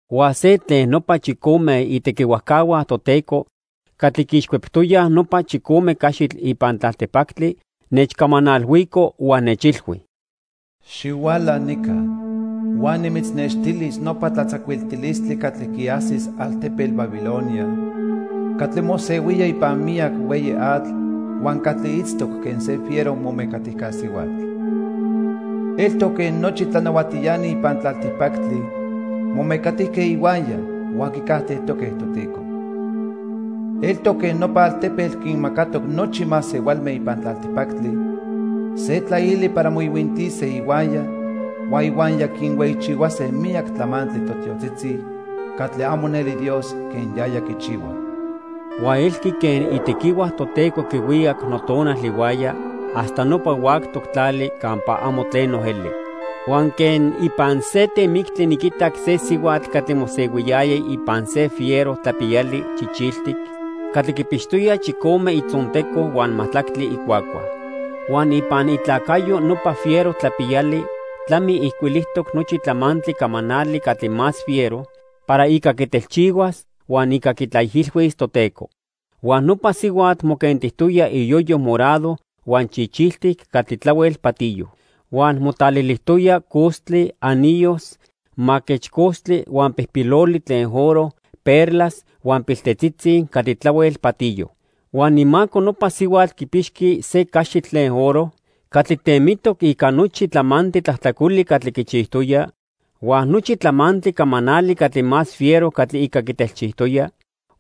Huan se tlen nopa chicome itequihuajcahua Toteco catli quiixcueptoyaj nopa chicome caxitl ipan tlaltipactli, nechcamanalhuico huan nechilhui: "Xihuala nica huan nimitznextilis nopa tlatzacuiltilistli catli quiajsis altepetl Babilonia catli mosehuía ipan miyac hueyi atl huan catli itztoc quen se fiero momecatijca sihuatl. Eltoc quen nochi tlanahuatiani ipan tlaltipactli momecatijque ihuaya huan quicajtejtoque Toteco. Eltoc quen nopa altepetl quinmacatoc nochi masehualme ipan tlaltipactli se tlaili para moihuintise ihuaya huan ihuaya quinhueyichihuase miyac tlamantli totiotzitzi catli amo neli Dios quen yaya quichihua." Huan elqui quen itequihua Toteco quihuicac notonal ihuaya hasta nopa huactoc tlali campa amo tleno eli. Huan quen ipan se temictli niquitac se sihuatl catli mosehuiyaya ipan se fiero tlapiyali chichiltic catli quipixtoya chicome itzonteco huan majtlactli icuacua. Huan ipan itlacayo nopa fiero tlapiyali tlami ijcuilijtoc nochi tlamantli camanali catli más fiero para ica quitelchihuas huan ica quitlaijilhuis Toteco. Huan nopa sihuatl moquentijtoya iyoyo morado huan chichiltic catli tlahuel patiyo. Huan motlalilijtoya costli, anillos, maquechcostli huan pijpiloli tlen oro, perlas huan piltetzitzi catli tlahuel patiyo. Huan imaco nopa sihuatl quipixqui se caxitl tlen oro catli temitoc ica nochi tlamantli tlajtlacoli catli quichijtoya huan nochi tlamantli camanali catli más fiero catli ica quitelchijtoya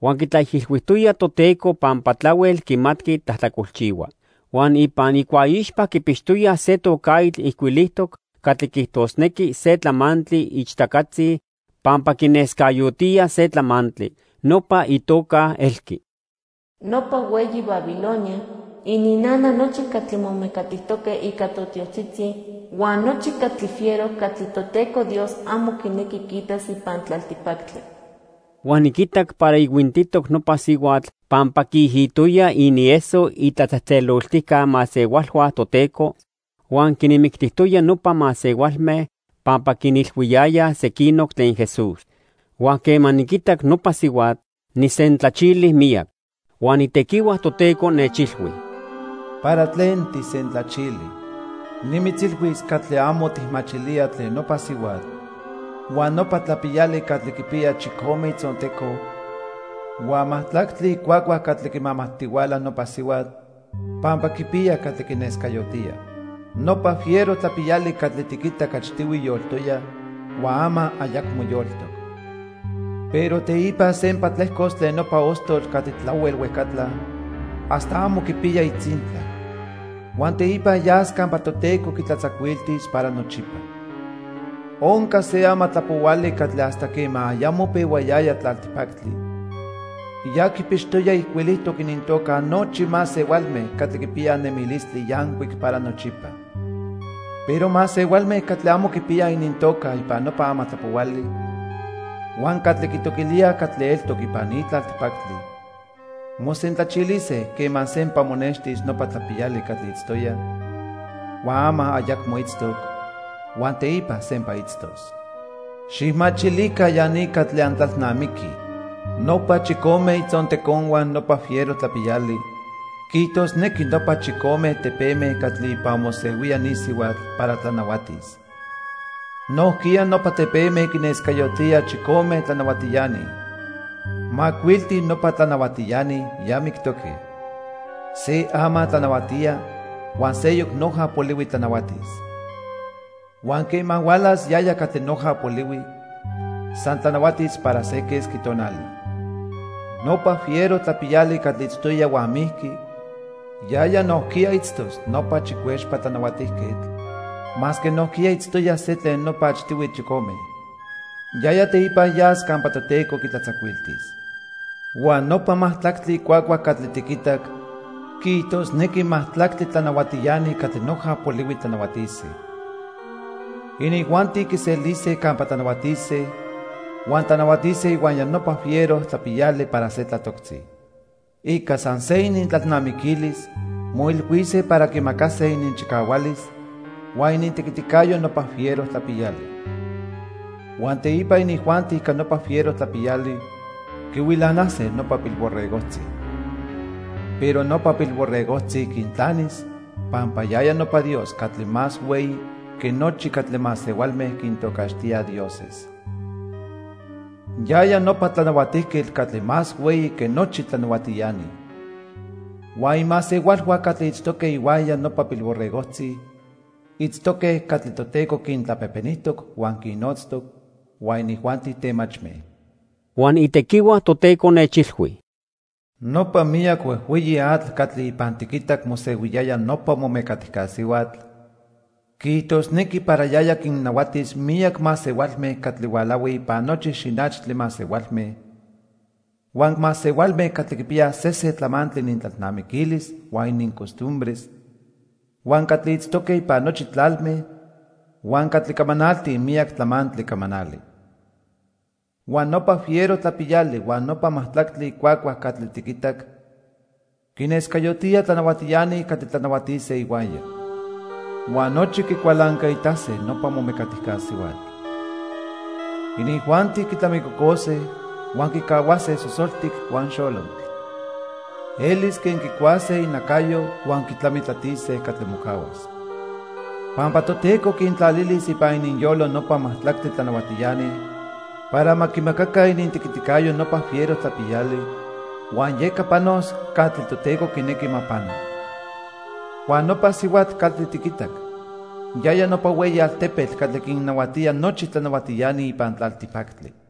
huan quitlaijilhuijtoya Toteco pampa tlahuel quimatqui tlajtlacolchihua. Huan ipan icuaixpa quipixtoya se tocaitl ijcuilijtoc catli quiijtosnequi se tlamantli ichtacatzi pampa quinescayotía se tlamantli. Nopa itoca elqui: Nopa hueyi Babilonia, ininnana nochi catli momecatijtoque ica totiotzitzi, huan nochi catli fiero catli Toteco Dios amo quinequi quiitas ipan tlaltipactli. Huan niquitac para ihuintitoc nopa sihuatl pampa quiijitoya inieso itlatzejtzeloltijca masehualhua Toteco huan quinmictijtoya nopa masehualme pampa quinilhuiyayaj sequinoc tlen Jesús. Huan quema niquitac nopa sihuatl, nijsentlachili miyac. Huan itequihua Toteco nechilhui: "¿Para tlen tijsentlachili? Nimitzilhuis catli amo tijmachilía tlen nopa sihuatl huan nopa tlapiyali catli quipiya chicome itzonteco huan majtlactli icuacua catli quimamajtihuala nopa sihuatl pampa quipiya catli quinescayotía. Nopa fiero tlapiyali catli tiquitac achtihui yoltoya huan ama ayacmo yoltoc. Pero teipa sempa tlejcos tlen nopa ostotl catli tlahuel huejcatla hasta amo quipiya itzintla. Huan teipa yas campa Toteco quitlatzacuiltis para nochipa. Onca se amatlapohuali catli hasta quema ayamo pehuayaya tlaltipactli ya quipixtoya ijcuilijtoc inintoca nochi masehualme catli quipiyaj nemilistli yancuic para nochipa. Pero masehualme catli amo quipiyaj inintoca ipan nopa amatlapohuali huan catli quitoquilíaj catli eltoc ipan ni tlaltipactli mosentlachilise quema sempa monextis nopa tlapiyali catli itztoya, huan ama ayacmo itztoc, huan teipa sempa itztos. "Xijmachilica ya ni catli antlalnamiquij. Nopa chicome itzonteconhua nopa fiero tlapiyali quiijtosnequi nopa chicome tepeme catli ipan mosehuía ni sihuatl para tlanahuatis. Nojquiya nopa tepeme quinescayotíaj chicome tlanahuatiani. Macuilti nopa tlanahuatiani ya mictoque, se ama tlanahuatía huan seyoc noja polihui tlanahuatis. Huan quema hualas yaya catli noja polihui, san tlanahuatis para se quesqui tonali. Nopa fiero tlapiyali catli itztoya huan mijqui, yaya nojquiya itztos nopa chicuexpa tlanahuatijquetl, masque nojquiya itztoya se tlen nopa achtihui chicome. Yaya teipa yas campa Toteco quitlatzacuiltis. "Huan nopa majtlactli icuacua catli tiquitac quiijtosnequi majtlactli tlanahuatiani catli noja polihui tlanahuatise. Inijuanti quiselise campa tlanahuatise huan tlanahuatise ihuaya nopa fiero tlapiyali para se tlatoctzi. Ica san se inintlalnamiquilis moilhuise para quimacase ininchicahualis huan inintequiticayo nopa fiero tlapiyali. Huan teipa inijuanti ica nopa fiero tlapiyali quihuilanase nopa Pilborregojtzi. Pero nopa Pilborregojtzi quintlanis pampa yaya nopa Dios catli más hueyi que nochi catli masehualme quintocaxtíaj dioses. Yaya nopa Tlanahuatijquetl catli más hueyi que nochi tlanahuatiani. Huan imasehualhua catli itztoque ihuaya nopa Pilborregojtzi itztoque catli Toteco quintlapejpenijtoc huan quinnotztoc, huan inijuanti temachme." Huan itequihua Toteco nechilhui: "Nopa miyac huejhueyi atl catli ipan tiquitac mosehuiyaya nopa momecatijca sihuatl quiijtosnequi para yaya quinnahuatis miyac masehualme catli hualahuij ipan nochi xinachtli masehualme, huan masehualme catli quipiyaj sesen tlamantli inintlalnamiquilis huan inincostumbres, huan catli itztoque ipan nochi tlalme, huan catli camanaltij miyac tlamantli camanali. Huan nopa fiero tlapiyali huan nopa majtlactli icuacua catli tiquitac quinescayotía tlanahuatiani catli tlanahuatise ihuaya. Huan nochi quicualancaitase nopa momecatijca sihuatl. Inijuanti quitlamicocose huan quicahuase sosoltic huan xolotl. Elis quen quicuase inacayo huan quitlamitlatise catli mocahuas. Pampa Toteco quintlalilis ipan ininyolo nopa majtlactli tlanahuatiani para ma quimacaca inintequiticayo nopa fiero tlapiyali, huan yeca panos catli Toteco quinequi ma pano. Huan nopa sihuatl catli tiquitac yaya nopa hueyi altepetl catli quinnahuatía nochi tlanahuatiani ipan tlaltipactli."